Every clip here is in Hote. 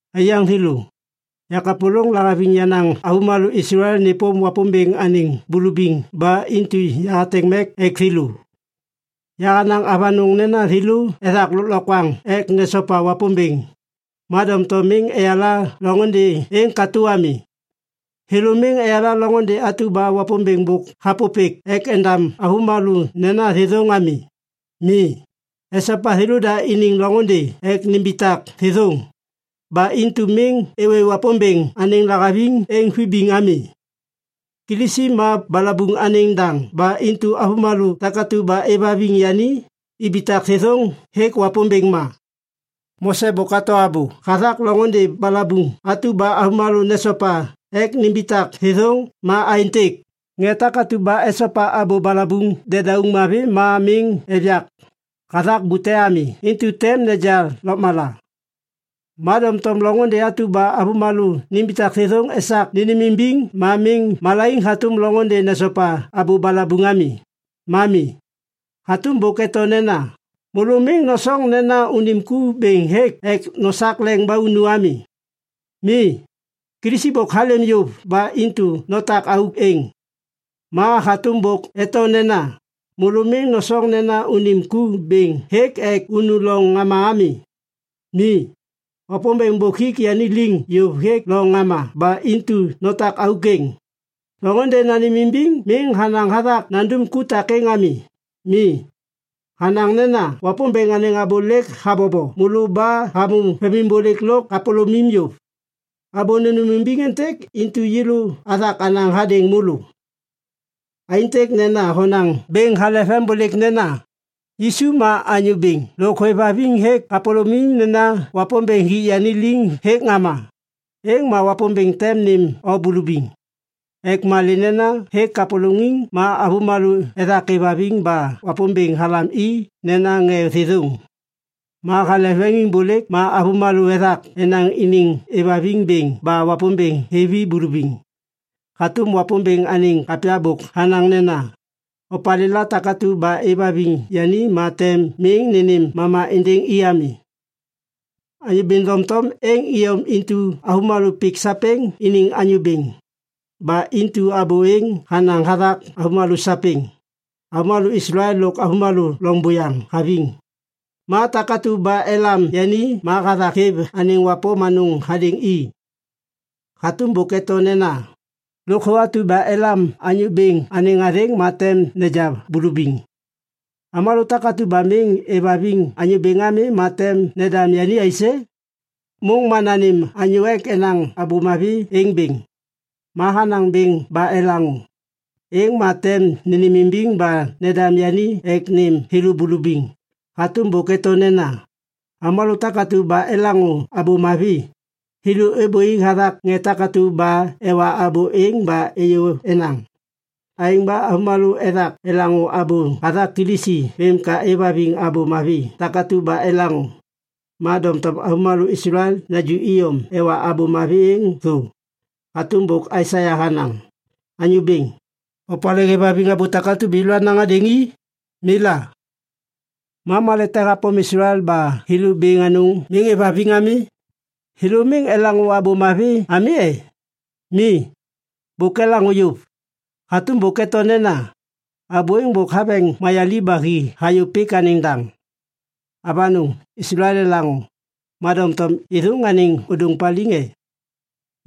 Aiyaŋ thêlô, yakapôlôŋ lahaviŋ yenaŋ avômalô Islael nêpôm Wapômbêŋ anêŋ bulubiŋ ba intu yahateŋ mek ek thêlô. Yahanaŋ avanôŋ nena thêlô ethak lôklokwaŋ ek nesopa Wapômbêŋ, ma doŋtom miŋ eyala loŋôndê êŋ katô ami. Thêlô miŋ eyala loŋôndê atu ba Wapômbêŋ bôk hapôpêk ek endam avômalô nena thêthôŋ ami. Mi, esopa thêlôda iniŋ loŋôndê ek nimbitak thêthôŋ. Ba intu miŋ êwê Wapômbêŋ anêŋ lahaviŋ êŋ vibiŋ ami. Kilisi ma balabuŋ anêŋ daŋ ba intu avômalô takatu ba êvhaviŋ yani ibitak thêthôŋ hêk Wapômbêŋ ma. Mose bôk hato abô hathak loŋôndê balabuŋ atu ba avômalô nesopa ek nimbitak thêthôŋ ma aêntêk, “Ŋê takatu ba esopa abô balabuŋ dedauŋ mavi ma miŋ êv yak hathak bute ami intu tem neja lôkmala.” Ma doŋtom loŋôndê atu ba avômalô nimbitak thêthôŋ esak nênêmimbiŋ ma miŋ malaiŋ hatôm loŋôndê nesopa abô balabuŋ ami, ma mi. Hatôm bôk eto nena, “Môlô miŋ nosoŋ nena unim ku bêŋ hêk ek nosak leŋ ba unu ami.” Mi, Kilisi bôk halêm yôv ba intu notak auk êŋ. Ma hatôm bôk eto nena, “Môlô miŋ nosoŋ nena unim ku bêŋ hêk ek unu loŋ ŋama ami.” Mi, Wapômbêŋ bôk hik yani liŋ yôv hêk loŋ ŋama ba intu notak auk êŋ. Loŋôndê nanêmimbiŋ miŋ hanaŋ hathak nandum ku takêŋ ami. Mi, hanaŋ nena, “Wapômbêŋ anêŋ abô lêk habobo môlô ba hamô vemimbôlêk lôk kapôlômim yôv.” Abô nênêmimbiŋ êntêk intu yêlô athak anaŋ hadêŋ môlô. Aêntêk nena honaŋ bêŋ hale vembôlêk nena, “Yisu ma Anyô Bêŋ” lôk hôêvhaviŋ hêk kapôlôm nena Wapômbêŋ hik yani liŋ hêk ŋama, êŋ ma Wapômbêŋ tem nêm o bulubiŋ. Ek malê nena hêk kapôlôŋiŋ ma avômalô ethak êvhaviŋ ba Wapômbêŋ halam i nena ŋê thêthôŋ. Ma hale veŋiŋbôlêk ma avômalô ethak enaŋ iniŋ êvhaviŋ bêŋ ba Wapômbêŋ hêv i bulubiŋ. Hatôm Wapômbêŋ anêŋ kapya bôk hanaŋ nena, “Opalêla takatu ba êvhaviŋ yani ma tem miŋ nênêm mama êndêŋ i ami.” Anyô Bêŋ doŋtom êŋ iyom intu avômalô pik sapêŋ iniŋ Anyô Bêŋ. Ba intu abô êŋ hanaŋ hathak avômalô sapêŋ, avômalô Islael lôk avômalô loŋ buyaŋ haviŋ. Ma takatu ba elam yani ma hathak hêv anêŋ wapôm anôŋ hadêŋ i. Hatôm bôk eto nena, “Lôkthô atu ba elam Anyô Bêŋ anêŋ athêŋ ma tem neja bulubiŋ.” Avômalô takatu ba miŋ êvhaviŋ Anyô Bêŋ ami ma tem nendam yani aisê? Môŋ ma nanêm anyô ek enaŋ Abô Mavi êŋ bêŋ. Ma hanaŋ bêŋ ba elaŋô, êŋ ma tem nênêmimbiŋ ba nendam yani ek nêm thêlô bulubiŋ. Hatôm bôk eto nena, “Avômalô takatu ba elaŋô Abô Mavi, thêlô êbôi hathak ŋê takatu ba ewa abô êŋ ba êyô enaŋ.” Aêŋ ba avômalô ethak elaŋô abô hathak Kilisi vêm ka êvhaviŋ Abô Mavi takatu ba elaŋô. Ma doŋtom avômalô Islael naju iyom ewa Abô Mavi êŋ thô. Hatôm bôk Aisaia hanaŋ, “Anyô Bêŋ, opalê hêvhaviŋ abô takatu ba yêlô anaŋ hadêŋ i? Mi la.” Ma malê te hapôm Islael ba thêlô bêŋ anôŋ miŋ êvhaviŋ ami? Thêlô miŋ elaŋô Abô Mavi ami e? Mi, bôk elaŋô yôv. Hatôm bôk eto nena, “Abô êŋ bôk haveŋ mayaliv ba hi hayô pik anêŋ daŋ.” Avanôŋ, Islael elaŋô, ma doŋtom êthôŋ anêŋ ôdôŋ paliŋ e?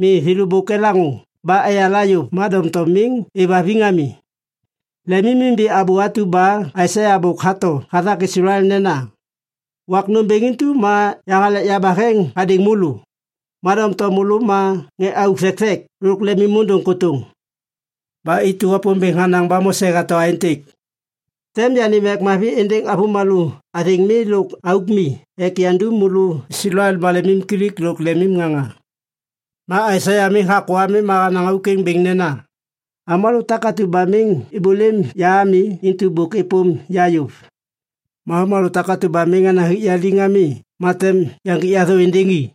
Mi, thêlô bôk elaŋô ba eyala yôv ma doŋtom miŋ êvhaviŋ ami. Lemimimbi abô atu ba Aisaia bôk hato hathak Islael nena, “Wak nômbêŋ intu ma yahalek yabaheŋ hadêŋ môlô, ma doŋtom môlô ma ŋê auk thekthek lôk lemimôndôŋ kôtôŋ.” Ba intu Wapômbêŋ hanaŋ ba Mose hato aêntêk, “Tem yanêm mek mavi êndêŋ avômalô athêŋ mi lôk auk mi ek yandum môlô Islael maleŋiŋkilik lôk leŋiŋŋaŋa.” Ma Aisaia miŋ hakô ami ma hanaŋ auk êŋ bêŋ nena, “Avômalô takatu ba miŋ êbôlêm ya ami intu bôk êpôm ya yôv. Ma avômalô takatu ba miŋ enaŋ hik ya liŋ ami ma tem yaŋgik ya thô êndêŋ i.”